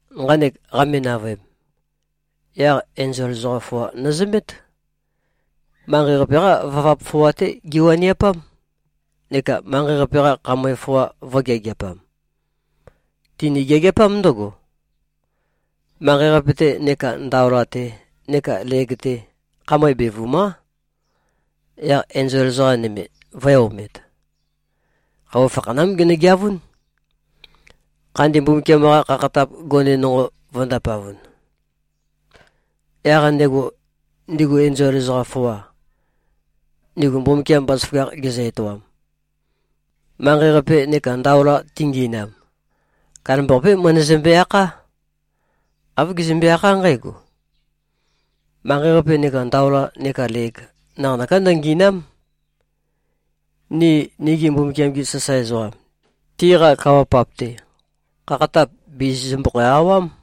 Nqanek qame-navøem, yaq enzol ezoqam foa nøzømét. Manqei-qape-qá vavap foa-té giwaniapám neka manqei-qape-qa khamøe foa vø̄geageapam. Tini-geageapám ndǿgo: Manqei-qape-te neka ndaola-te neka leg-te, khamøe bevùma᷄. Yaq enzol ezoqa nøme vø̄e-omet. Khøuwa fakhanám genøgeavún, Khandi Mbumbukiam-qa khakhatap gone nonqo vø̄ndapavun. Yaq ndego, ndigu enzol ezoqam foa, ndigu Mbumbukiam bazaføgakh gezø-etoam, manqei-qape neka ndaola tingi꞉nam, kandambaqapé møndøzømbe-akhá. Āv gezømbe-akhá nqǽgo, “Manqei-qape neka ndaola neka leg, naqanøká ndøngì꞉na᷄m. Ni nigi Mbumbukiam-gi sasae ezoqam, tiqa kawa-pap-te, khakhatap bìzizømbøkhæ-awám.”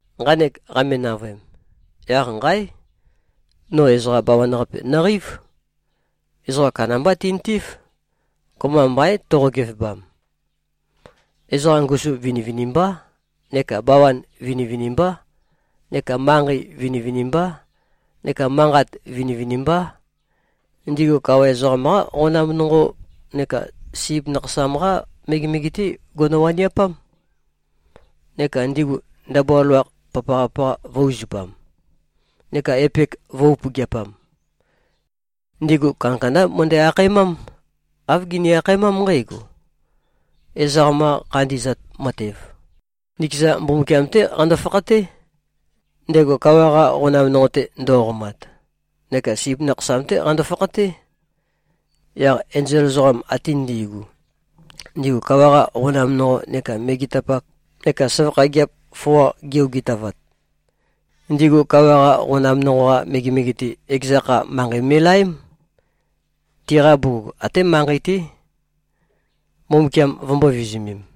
Nqanek qame-navøem, yaq nqáe! No ezoqa bawan-qape nøqeív. Ezoqa kandambá tintív. Kopømba mbaín, toqo-gevebam. Ezoqa ngusu vinivinimbá neka bawan vinivinimbá neka manqei vinivinimbá neka manqat vinivinimbá. Ndigu kawa ezoqam-qá qonam nonqo neka Sip Nakhasam-qá megemege-té gono-waniapám. Neka ndigu ndabua loloakh papaqa-papaqa vø̄-uzupam neka epek vø̄-upøgeapam. Ndigu kandakandá møndæ-akhaemám. Āv gini-akhaemám nqǽgo, “Ezoqam-qa khandi꞉zat matev, nikeza Mbumbukiam-té qando-fakhaté, ndego kawa-qa qonam nonqo-te ndo꞉qomat, neka Sip Nakhasam-té qando-fakhaté.” Yaq enzol ezoqam ate ndi꞉gu, ndigu kawa-qa qonam nonqo neka megetapak neka søvakha gigiap foa gi-ogitavat, ndigu kawa-qa qonam nonqo-qa megemege-te, ekeza kha, manqei me꞉laém, tiqa bugug até manqei-té, Mbumbukiam vømbō-vizumem.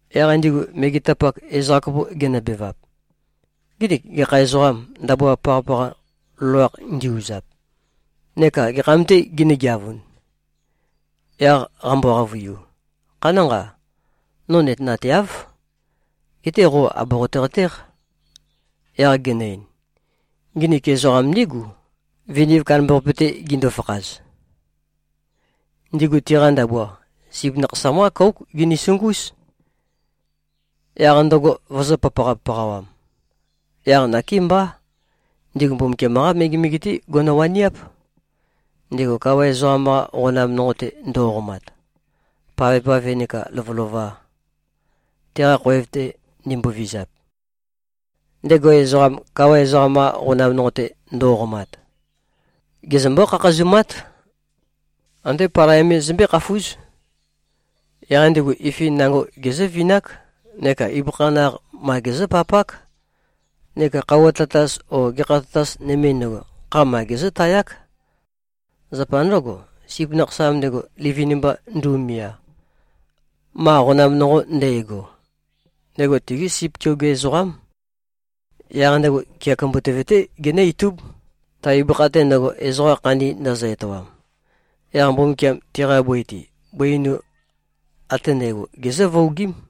Yaq ndigu megetapak, ezoqa kopo genøbevap, “Nginik gekha ezoqâm, ndabua papaqa-papaqa loloakh ndi-uzap, neka gekham-tē ginǿ-geavun?” Yaq qambo-qavøiu, “Khanánqa! No nøtenateáv. Geté qo àboqote-qatéq.” Yaq genø-ein, “Nginik ezoqam ndígu, viniv kandambaqape-te gindu-fakhaz. Ndigu tiqa ndabua, Sip Nakhasam-qá kóuk ginisungúz, yaq ndøgo vøzø̄-papaqa-papaqawam. Yaq nakémbá, ndigu Mbumbukiam-qá megemege-té gono-waniáp, ndego kawa ezoqam-qa qonam nonqo-te ndo꞉qomat, pavpave nekā lovølova, teqa khoev-te ndimbovizap. Ndego ezoqam, kawa ezoqam-qa qonam nonqo-te ndo꞉qomat, gezømbó-khakhazumát. Andé palai me zømbé-khafúz. Yaq ndigu ifin nango gezǿvinák neka ibøkha naq ma gezǿpapák neka khøuwa tatas o gekha tatas nøme ndøgo, kha ma gezǿtayák. Zapa ndǿgo, Sip Nakhasam ndego, livin-mba ndu꞉mia, ma qonam nonqo ndægo, ndego tigí sip keoge ezoqám. Yaq ndego kea kumbutøve-té genǿ-itúb, ta ibøkha-te ndøgo, ezoqa khandi ndøzø-etoam. Yaq Mbumbukiam tiqa bøi-te, bøi einu ate ndægo, gezǿ-vuogím.”